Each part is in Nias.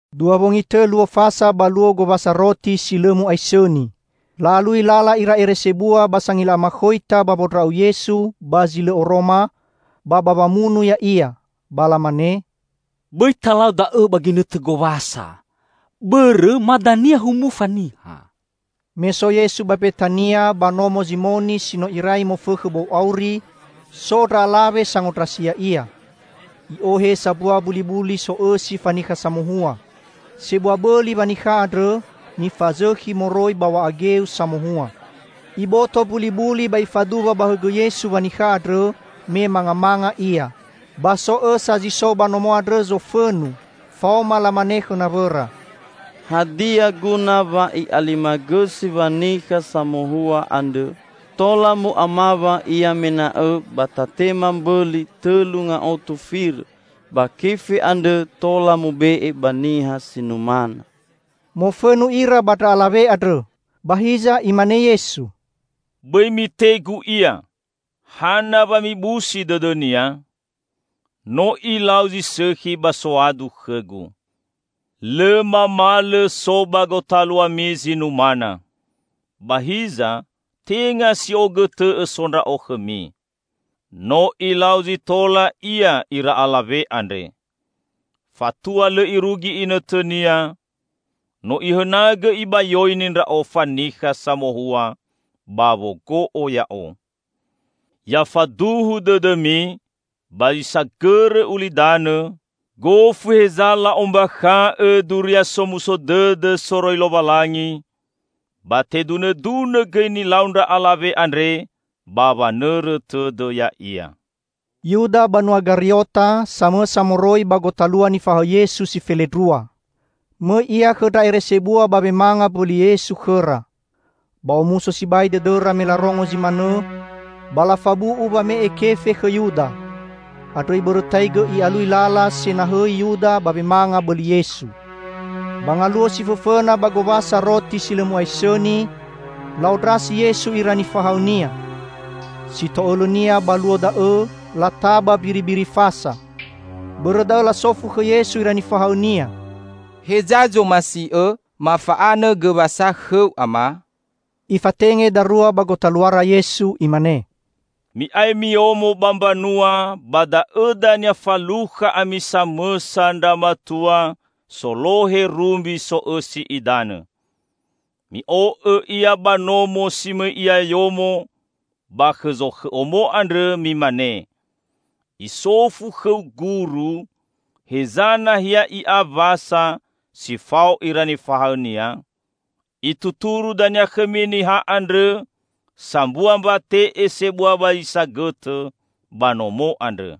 Dua wongi tõ luo Fasa ba luo Gowasa Roti si Lõ Mu'aisõni. La'alui lala ira ere sebua ba sangila amakhoita ba wondra'u Yesu ba zi lõ oroma, ba ba wamunu Ya'ia. Ba lamane, "Bõi talau da'õ ba ginõtõ Gowasa, bõrõ ma dania humufa niha." Me so Yesu ba Mbetania, ba nomo Zimoni si no irai mofõkhõ bou auri, so ndra alawe sangondrasi Ya'ia. I'ohe sambua mbulibuli so'õsi fanikha samohua. Sebua bõli wanikha andrõ, nifazõkhi moroi ba w̃a'a geu samohua. Iboto mbulibuli ba ifaduwa ba hõgõ Yesu wanikha andrõ, me mangamanga Ia. Ba so õsa zi so ba nomo andrõ zofõnu, faoma lamane khõ nawõra, "Hadia guna wa i'alimagõsi wanikha samohua andrõ? Tola mu'amawa ia mena'õ ba tatema mbõli tõlu ngaotu firõ; ba kefe andrõ tola mube'e ba niha si numana!" Mofõnu ira ba ndra alawe andrõ. Ba hiza Imane Yesu, "Bõi mitegu ia! Hana wa mibusi dõdõnia? No ilau zi sõkhi ba soadu khõ-Gu. Lõ mamalõ so ba gotaluami zi numana. Ba hiza tenga si'ogõtõ'õ so Ndra'o khõmi. No ilau zi tola ia ira alawe andre. Fatua lõ irugi inõtõnia, no ihõnagõ ibayoini Ndra'o fanikha samohua ba wogo'o Ya'o. Ya faduhu dõdõmi ba zi sagõrõ ulidanõ, gofu heza la'ombakha'õ Duria Somuso Dõdõ soroi Lowalangi, ba tedunõdunõ gõi nilau ndra alawe andre ba wanõrõ tõdõ ya'ia." Yuda banua Gariota, samõsa moroi ba gotalua nifahaõ Yesu si felendrua. Mõi ia khõ ndra ere sebua ba wemanga mbõli Yesu khõra. Ba omuso sibai dõdõra me larongo zi manõ, ba lafabu'u wame'e kefe khõ Yuda. Andrõ ibõrõtaigõ i'alui lala senahõi Yuda ba wemanga bõli Yesu. Ba ngaluo si fõfõna ba Gowasa Roti si Lõ Mu'aisõni, la'ondrasi Yesu ira nifahaõ-Nia. Sito'õlõnia ba luo da'õ lataba mbiribiri Fasa. Bõrõ da'õ lasofu khõ Yesu ira nifahaõ-Nia, "Heza zomasi'Õ mafa'anõ gõ Wasa khõ-U, Ama?" Ifatenge darua ba gotaluara Yesu. Imane, "Mi'ae miyomo ba mbanua, ba da'õ dania falukha ami samõsa ndra matua solohe rumbi so'õsi idanõ. Mi'o'õ ia, ba nomo si mõi ia yomo, ba khõ zokhõ omo andrõ, mimane, 'Isofu khõu Guru, heza nahia I'a Wasa si fao ira nifahaõ-Nia?' Ituturu dania khõmi niha andrõ sambua mbate'e sebua ba zi sagõtõ, ba nomo andrõ.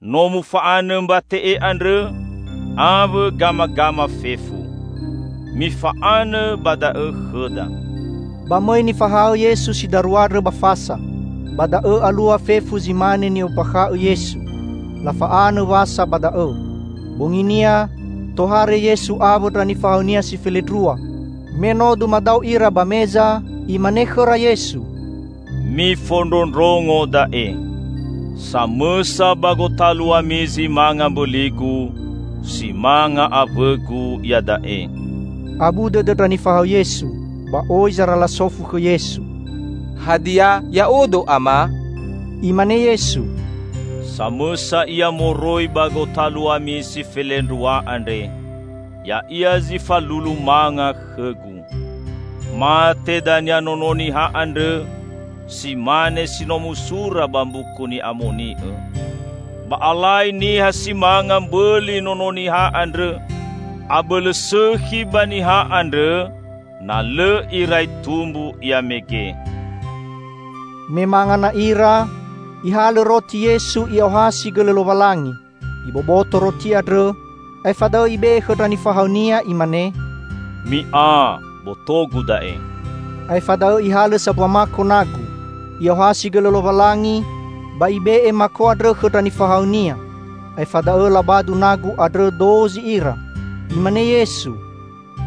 No mufa'anõ mbate'e andrõ, awõ gamagama fefu. Mifa'anõ ba da'õ khõda." Ba mõi nifahaõ Yesu si darua andrõ ba fasa. Ba da'õ alua fefu zi mane ni'ombakha'õ Yesu. Lafa'anõ Wasa ba da'õ. Bonginia, tohare Yesu awõ ndra nifahaõ-Nia si felendrua. Me no dumadao ira ba meza, Imane khõra Yesu, "Mifondrondrongo da'e: samõsa ba gotaluami zi manga mbõli-Gu, si manga awõ-Gu iada'e." Abu dõdõ ndra nifahaõ Yesu. Ba oi zara lasofu khõ Yesu, "Hadia ya'odo Ama?" Imane Yesu, "Samõsa ia moroi ba gotaluami si felendrua andre. Ya'ia zi falulu manga khõ-Gu. Mate dania Nono Niha andrõ si mane si no musura bakha ba Mbuku Ni'amoni'õ. Ba alai niha si manga mbõli Nono Niha andrõ! Abõlõ sõkhi ba niha andrõ na lõ irai tumbu ia mege!" Me manga na ira, Ihalõ roti Yesu I'aohasi gõlõ Lowalangi. Iboboto roti andrõ, aefa da'õ Ibe'e khõ ndra nifahaõ-Nia Imane, "Mi'a, boto-Gu da'e!" Aefa da'õ Ihalõ sambua mako nagu. I'aohasi gõlõ Lowalangi, ba Ibe'e mako andrõ khõ ndra nifahaõ-Nia. Aefa da'õ labadu nagu andrõ dozi ira. Imane Yesu,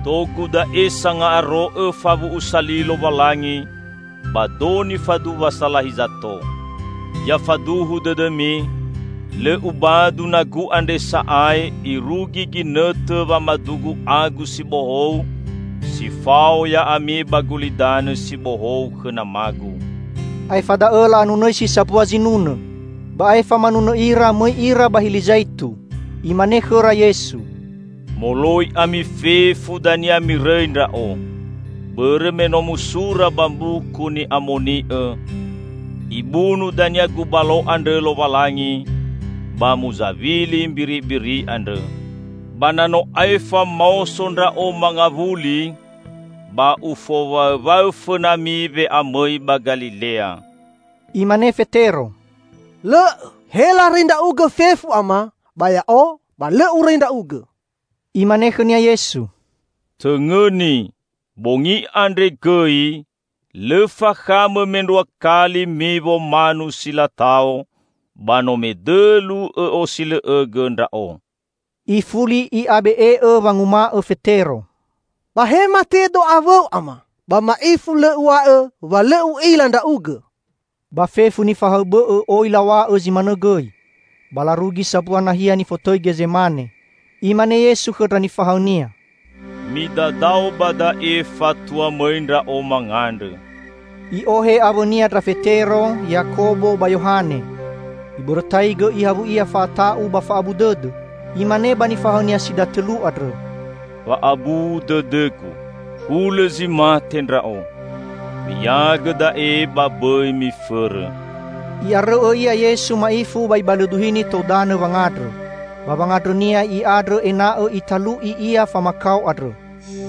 "Do-Gu da'e sanga'aro'õ fawu'usa li Lowalangi, ba do nifaduwa salahi zato. Ya faduhu dõdõmi: Lõ Ubadu nagu andre sa'ae irugi ginõtõ wamadu-Gu agu si bohou si fao ya'ami ba Gulidanõ si Bohou khõ Nama-Gu." Aefa da'õ la'anunõisi sambua zinunõ. Ba aefa manunõ ira, mõi ira ba Hili Zaitu. Imane khõra Yesu, "Moloi ami fefu dania mirõi Ndra'o. Bõrõ me no musura ba Mbuku Ni'amoni'õ, 'Ibunu dania gubalo andrõ Lowalangi, ba muzawili mbiribiri andrõ.' Ba na no aefa maoso Ndra'o mangawuli, ba Ufowaõwaõ fõnami we'amõi ba Galilea." Imane Fetero, "Lõ'õ, he larõi Ndra'ugõ fefu Ama, ba ya'o ba lõ urõi Ndra'ugõ." Imane khõnia Yesu, "Tõngõni, bongi andre gõi, lõ fakhamõ mendrua kali miwo manu silatao, ba no medõlu õ'osilõ'õgõ Ndra'o." Ifuli i'abe'e'õ wanguma'õ Fetero, "Ba he matedo awõ-U Ama, ba ma'ifu lõ uw̃a'õ wa lõ u'ila Ndra'ugõ!" Ba fefu nifahaõ bõ'õ oi law̃a'õ zi manõ gõi. Ba larugi sambua nahia nifotõi Gezemane. Imane Yesu khõ ndra nifahaõ-Nia, "Midadao ba da'e fatua mõi Ndra'o mangandrõ." I'ohe awõ-Nia ndra Fetero, Yakobo ba Yohane. Ibõrõtaigõ ihawui Ia fa'ata'u ba fa'abu dõdõ. Imane ba nifahaõ-Nia si datõlu andrõ, "Wa'abu dõdõ-Gu, hulõ zi mate Ndra'o. Mi'iagõ da'e ba bõi mifõrõ!" I'arõu'õ Ia Yesu ma'ifu ba Ibalõduhini tou danõ wangandrõ. Ba wangandrõ-Nia I'andrõ ena'õ italu'i Ia famakao andrõ.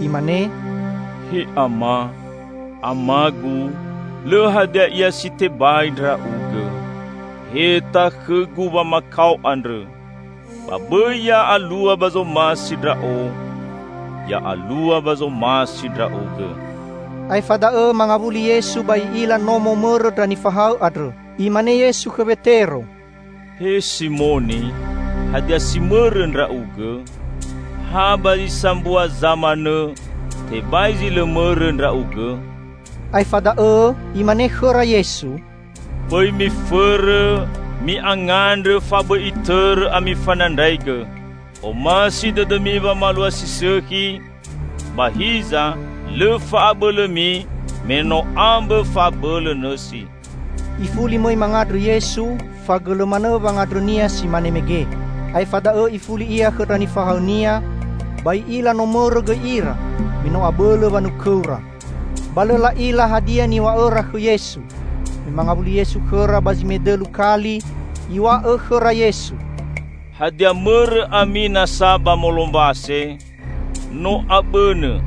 Imane, "He Ama, Amagu, lõ hadia ia si tebai Ndra'ugõ. Heta khõ-Gu wamakao andrõ. Ba bõi ya'alua ba zomasi Ndra'o, ya'alua ba zomasi Ndra'ugõ." Aefa da'õ mangawuli Yesu ba I'ila no momõrõ ndra nifahaõ andrõ. Imane Yesu khõ Wetero, "He Simoni, hadia si mõrõ ndra'ugõ? Ha ba zi sambua za manõ, tebai zi lõ mõrõ ndra'ugõ?" Aefa da'õ Imane khõra Yesu, "Bõi mifõrõ, mi'angandrõ fabõi itõrõ ami fanandraigõ. Omasi dõdõmi wamalua si sõkhi, ba hiza lõ fa'abõlõmi me no ambõ fa'abõlõ nõsi." Ifuli mõi mangandrõ Yesu, fagõlõ manõ wangandrõ-Nia si mane mege. Aefa da'õ Ifuli Ia khõ ndra nifahaõ-Nia, ba I'ila no mõrõ gõi ira, me no abõlõ wanukõura. Ba lõ la'ila hadia niw̃a'õra khõ Yesu. Me mangawuli Yesu khõra ba zi medõlu kali, Iw̃a'õ khõra Yesu, "Hadia mõrõ ami nasa ba molombase? No abõnõ!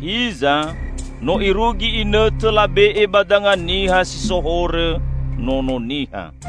Hiza, no irugi inõtõ labe'e ba danga niha si so horõ Nono Niha.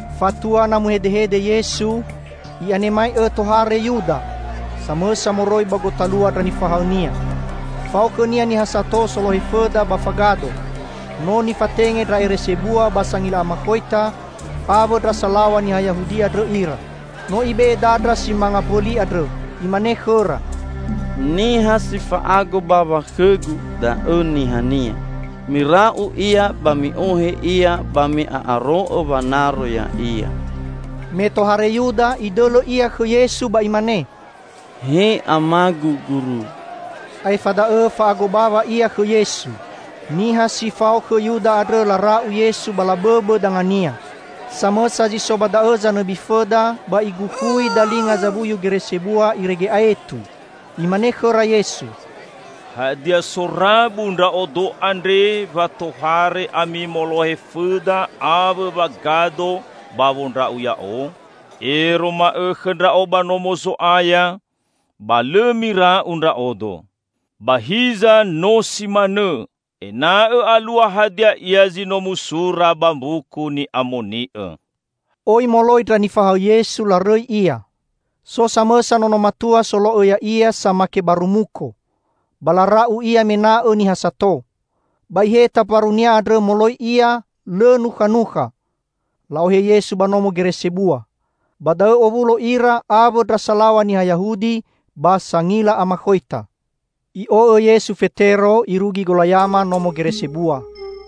Fatua na muhedehede Yesu, i'anemai'õ tohare Yuda, samõsa moroi ba gotalua ndra nifahaõ-Nia. Fao khõnia niha sato solohe fõda ba fagado. No nifatenge ndra ere sebua, ba sangila amakhoita awõ ndra salaw̃a niha Yahudi andrõ ira. No ibe'e dandra si manga mbõli andrõ. Imane khõra, "Niha si fa'ago bawa khõgu, da'õ nihania. Mira'u Ia ba mi'ohe Ia ba mi'a'aro'õ wanaro Ya'ia." Me tohare Yuda, idõlõ ia khõ Yesu ba imane, "He Amagu Guru!" Aefa da'õ fa'ago bawa ia khõ Yesu. Niha si fao khõ Yuda andrõ lara'u Yesu ba labõbõ danga-Nia. Samõsa zi so ba da'õ zanõbi fõda ba igukhui dalinga zawuyu gere sebua irege aetu. Imane khõra Yesu, "Hadia, sorabu Ndra'odo andre, wa tohare ami molohe fõda awõ wagado ba wondra'u Ya'o? Ero ma'õkhõ Ndra'o ba Nomo Zo'aya, ba lõ mira'u Ndra'odo. Ba hiza no si manõ ena'õ alua hadia ia zi no musura ba Mbuku Ni'amoni'õ." Oi moloi ndra nifahaõ Yesu, larõi Ia. So samõsa nono matua solo'õ Ya'ia samake baru muko. Ba lara'u ia mena'õ niha sato. Ba iheta mbarunia andrõ moloi ia lõ nukhanukha. La'ohe Yesu ba nomo gere sebua. Ba da'õ owulo ira, awõ ndra salaw̃a niha Yahudi ba sangila amakhoita. I'o'õ Yesu Fetero, irugi golayama nomo gere sebua,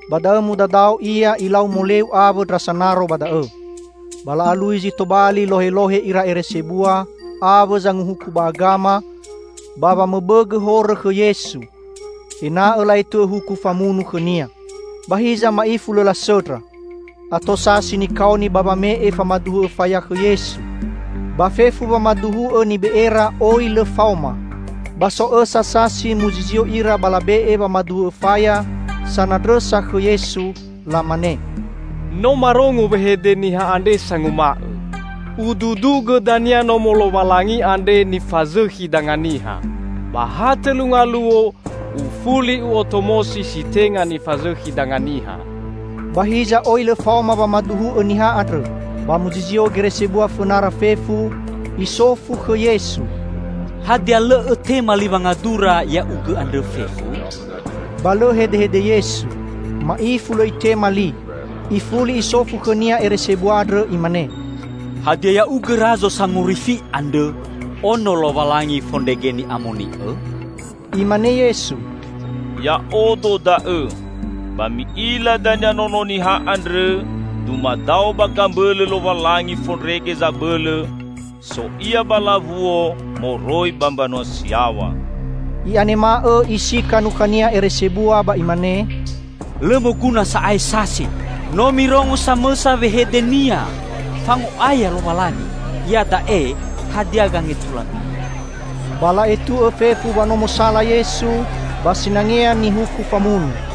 ba da'õ mudadao ia, ilau moleu awõ ndra sanaro ba da'õ. Ba la'alui zi tobali lohelohe ira ere sebua awõ Zanguhuku ba Agama ba wamõbõgõ horõ khõ Yesu, ena'õ la'etu'õ huku famunu khõ-Nia. Ba hiza ma'ifu lõ lasõndra. Ato sasi nikaoni ba wame'e famaduhu'õ faya khõ Yesu. Ba fefu wamaduhu'õ nibe'era oi lõ faoma. Ba so õsa sasi muzizio ira ba labe'e wamaduhu'õ faya sanandrõsa khõ Yesu. Lamane, "No marongo wehede niha andre sanguma'õ, 'Ududugõ dania nomo Lowalangi andre nifazõkhi danga niha, ba ha tõlu ngaluo Ufuli U'otomosi si tenga nifazõkhi danga niha.'" Ba hiza oi lõ faoma wamaduhu'õ niha andrõ. Ba muzizio gere sebua fõnara fefu, isofu khõ Yesu, "Hadia lõ Õtema li wangadura Ya'ugõ andrõ fefu?" Ba lõ hedehede Yesu. Ma'ifu lõ Itema li. Ifuli isofu khõnia ere sebua andrõ imane, "Hadia Ya'ugõ Razo Sangorifi andrõ, Ono Lowalangi fondrege Ni'amoni'õ?" Imane Yesu, "Ya'odo da'õ! Ba mi'ila dania Nono Niha andrõ dumadao ba gambõlõ Lowalangi Fondrege Zabõlõ, so Ia ba lawuo moroi mbanua si yaw̃a!" I'anema'õ isika nukhania ere sebua ba imane, "Lõ moguna sa'ae sasi! No mirongo samõsa wehede-Nia fango'aya Lowalangi. Iada'e hadia gangetulami?" Ba la'etu'õ fefu wa no mosala Yesu, ba sinangea nihuku famunu.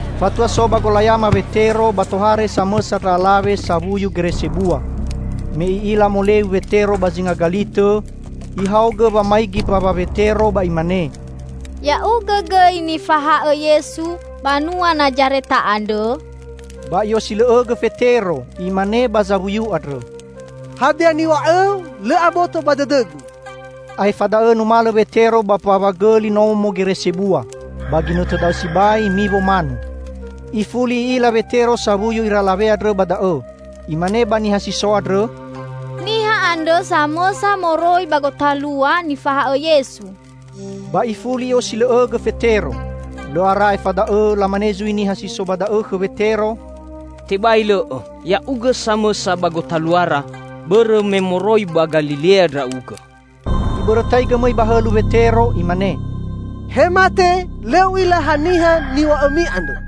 Fatua so ba golayama Wetero, ba tohare samõsa ndra alawe sawuyu gere sebua. Me i'ila moleu Wetero ba zinga galitõ, ihaogõ wamaigi mbawa Wetero ba imane, "Ya'ugõ gõi nifahaõ Yesu banua Nazareta andrõ?" Ba i'osilõ'õgõ Fetero, imane ba zawuyu andrõ, "Hadia niw̃a'õu, lõ aboto ba dõdõgu." Aefa da'õ numalõ Wetero ba mbawa gõli nomo gere sebua andrõ. [Ba ginõtõ da'õ sibai, miwo manu.] Ifuli i'ila Wetero sawuyu ira alawe andrõ ba da'õ. Imane ba niha si so andrõ, "Niha andrõ samõsa moroi ba gotalua nifahaõ Yesu!" Ba ifuli i'osilõ'õgõ Fetero. Lõ ara aefa da'õ, lamane zui niha si so ba da'õ khõ Wetero, "Tebai lõ'õ, ya'ugõ samõsa ba gotaluara, bõrõ me moroi ba Galilea ndra'ugõ!" Ibõrõtaigõ mõi ba hõlu Wetero. Imane, "He mate, lõ u'ila haniha niw̃a'õmi andrõ!"